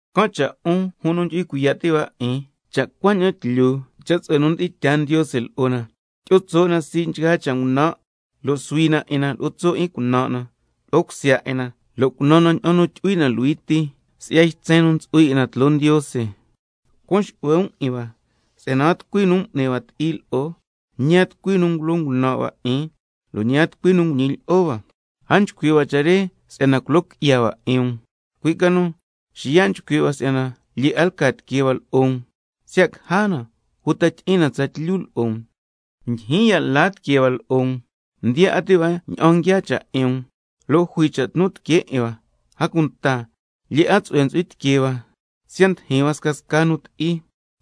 Can' cha' 'un jun nu ndyu'hui cuiya' ti' hua 'in, cha' cuaña'an tlyu cha' tsu'hue nu mdi'in tyaa Ndiose lo'o na, tyi'o tso' na sii' nchgaa cha' ngunan' lo' suhui na 'in na lo'o tso' 'in cunan' na lo'o cusya 'in na, lo' cunan na ña'an tyu'hui na luhui ti si'ya ytsen nu ntsu'hui 'in na tloo Ndiose. Cuan xu'hue um 'in hua, si'yana a tucui nu m'ni hua ti'i lo'o, ñi a tucui nu ngulo ngunan' hua 'in, lo' ñi a tucui nu nguñi lyi'o hua. A nchcui' hua cha' re si'yana culo qui'ya hua 'in um, cui' ca nu xiya' nchcui' hua si'yana lyee 'a lca tiquee hua lo'o um, siya' caja na uta tyi'in na tsatlyu lo'o um. Ndyijyin ya' la tiquee hua lo'o um, ndiya 'a ti' hua ña'an nguiaa cha' 'in um, lo' jui cha' tnu tiquee 'in hua, a cunta lyee 'a tsu'hue ntsu'hui tiquee hua siya' ndijin hua scasca nu ti'i.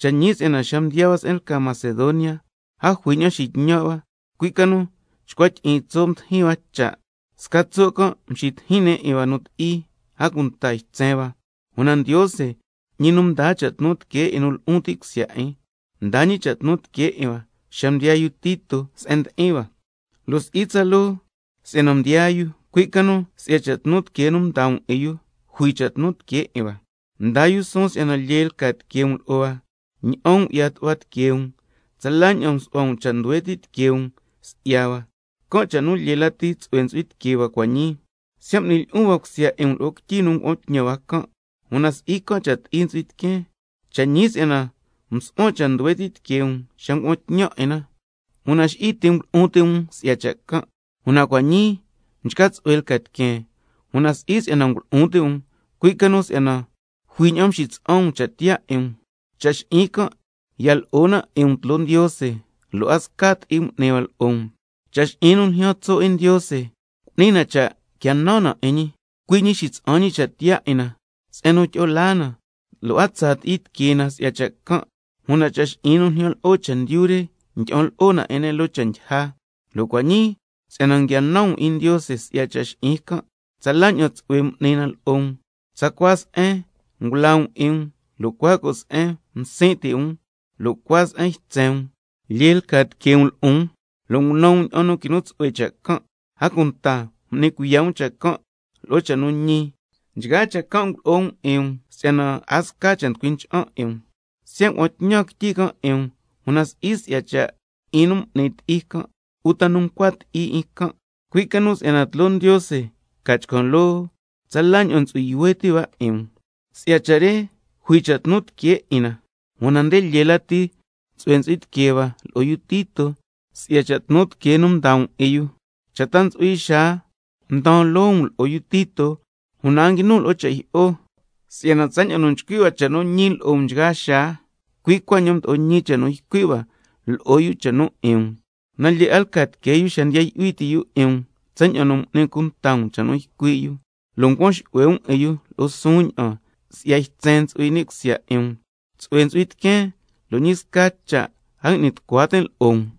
Cha' ñi si'yana xa mdiyaa hua se'en lca Macedonia, a jui ña'an xitñan' hua, cui' ca nu chcua tyi'iin tso' mdijin hua cha', sca tso' can' mxitijin ne' 'in hua nu ti'i, a cunta ytsen hua. Una Ndiose, ñi nu ndaa cha' tnu tiquee 'in nu lu'un ti' cusya 'in, mdaa ñi cha' tnu tiquee 'in hua xa mdiyaa yu Tito se'en ndi'in hua. Lo' si'i tsaloo si'yana mdiyaa yu, cui' ca nu si'ya cha' tnu tiquee nu mdaa um 'in yu jui cha' tnu tiquee 'in hua, mdaa yu suun si'yana lyee lca tiquee um lo'o hua, ña'an ngu'ya tu'hua tiquee um, tsala ña'an nsu'hua um cha' nduhue ti' tiquee um si'ya hua, can' cha' nu lyee lati tsu'hue ntsu'hui tiquee hua cua' ñii. Siya' m'nin lyi'un cusya 'in um lo'o quityi nu ngua'an tñan can', una si'i can' cha' ti'i ntsu'hui tiqueen. Cha' ñi si'yana msu'huan cha' nduhue ti' tiqueen xa ngua'an tñan 'in na, una xi'i ti' ngulu'un ti' um si'ya cha' can'. Una cua' ñii mchca tsu'hue lca tiqueen, una si'i si'yana ngulu'un ti' um, cui' ca nu si'yana jui ña'an xitsa'an um cha' tiyaa 'in um. Cha' xi'in can' ya lo'o na 'in um tloo Ndiose, lo' a sca ti'i m'ni hua lo'o um. Cha' xi'in nu ljyaan tso' 'in Ndiose cu'ni na cha' quia nan na 'in ñi, cui' ñi xitsa'an ñi cha' tiyaa 'in na se'en nu tyi'o laa na, lo' a tsaa ti'i tiquee na si'ya cha' can', una cha' xi'in nu ljyan lo'o chendyu re ndyi'an lo'o na 'in ne' loo cha' ndyija. Una cua' ñii si'yana nguia nan um 'in Ndiose si'ya cha' xi'in can', tsala ña'an tsu'hue m'ni na lo'o um: Tsacua se'en ngulaa um 'in um, lo' cua co' se'en msin' ti' um, lo' cua se'en ytsen um, lyee lca tiquee um lo'on, lo' ngunan um ña'an nu quinu tsu'hue cha' can', a cunta m'ni cuiya' um cha' can' lo'o cha' nu ñi. Nchgaa cha' can' ngulo'o um 'in um si'yana a sca cha' nducui ncha'an 'in um. Siya' ngua'an tñan quityi can' 'in um, una si'i si'ya cha' 'in nu m'ni ti'i can' uta nu ncua ti'i 'in can', cui' ca nu si'yana tloo Ndiose ca chcan' loo tsala ña'an ntsu'hui yuhue ti' hua 'in um. Si'ya cha' re tsatlyu jui cha' tnu tiquee 'in na lo'o um, una nde lyee lati tsu'hue ntsu'hui tiquee hua tsatlyu lo'o yu Tito, si'ya cha' tnu tiquee nu mdaa um 'in yu. Cha' ta ntsu'hui xaa mdaan loo um lo'o yu Tito, una a nguinun lo'o cha' jyi'o, si'yana tsaña'an nu nchcui' hua cha' nu ñi lo'o um nchgaa xaa, cui' cuaña'an mdo'o ñi cha' nu ycui' hua lo'o yu cha' nu 'in um. Una lyee 'a lca tiquee yu xa ndiya yu'hui ti' yu 'in um tsaña'an m'ni um cunta cha' nu ycui' yu, lo' ncuan xu'hue um 'in yu lo'o suun ña'an si'ya ytsen nu ntsu'hui ni' cusya 'in um. Tsu'hue ntsu'hui tiqueen, lo' ñi sca cha' a ngui'ni tucua tin' lo'o um.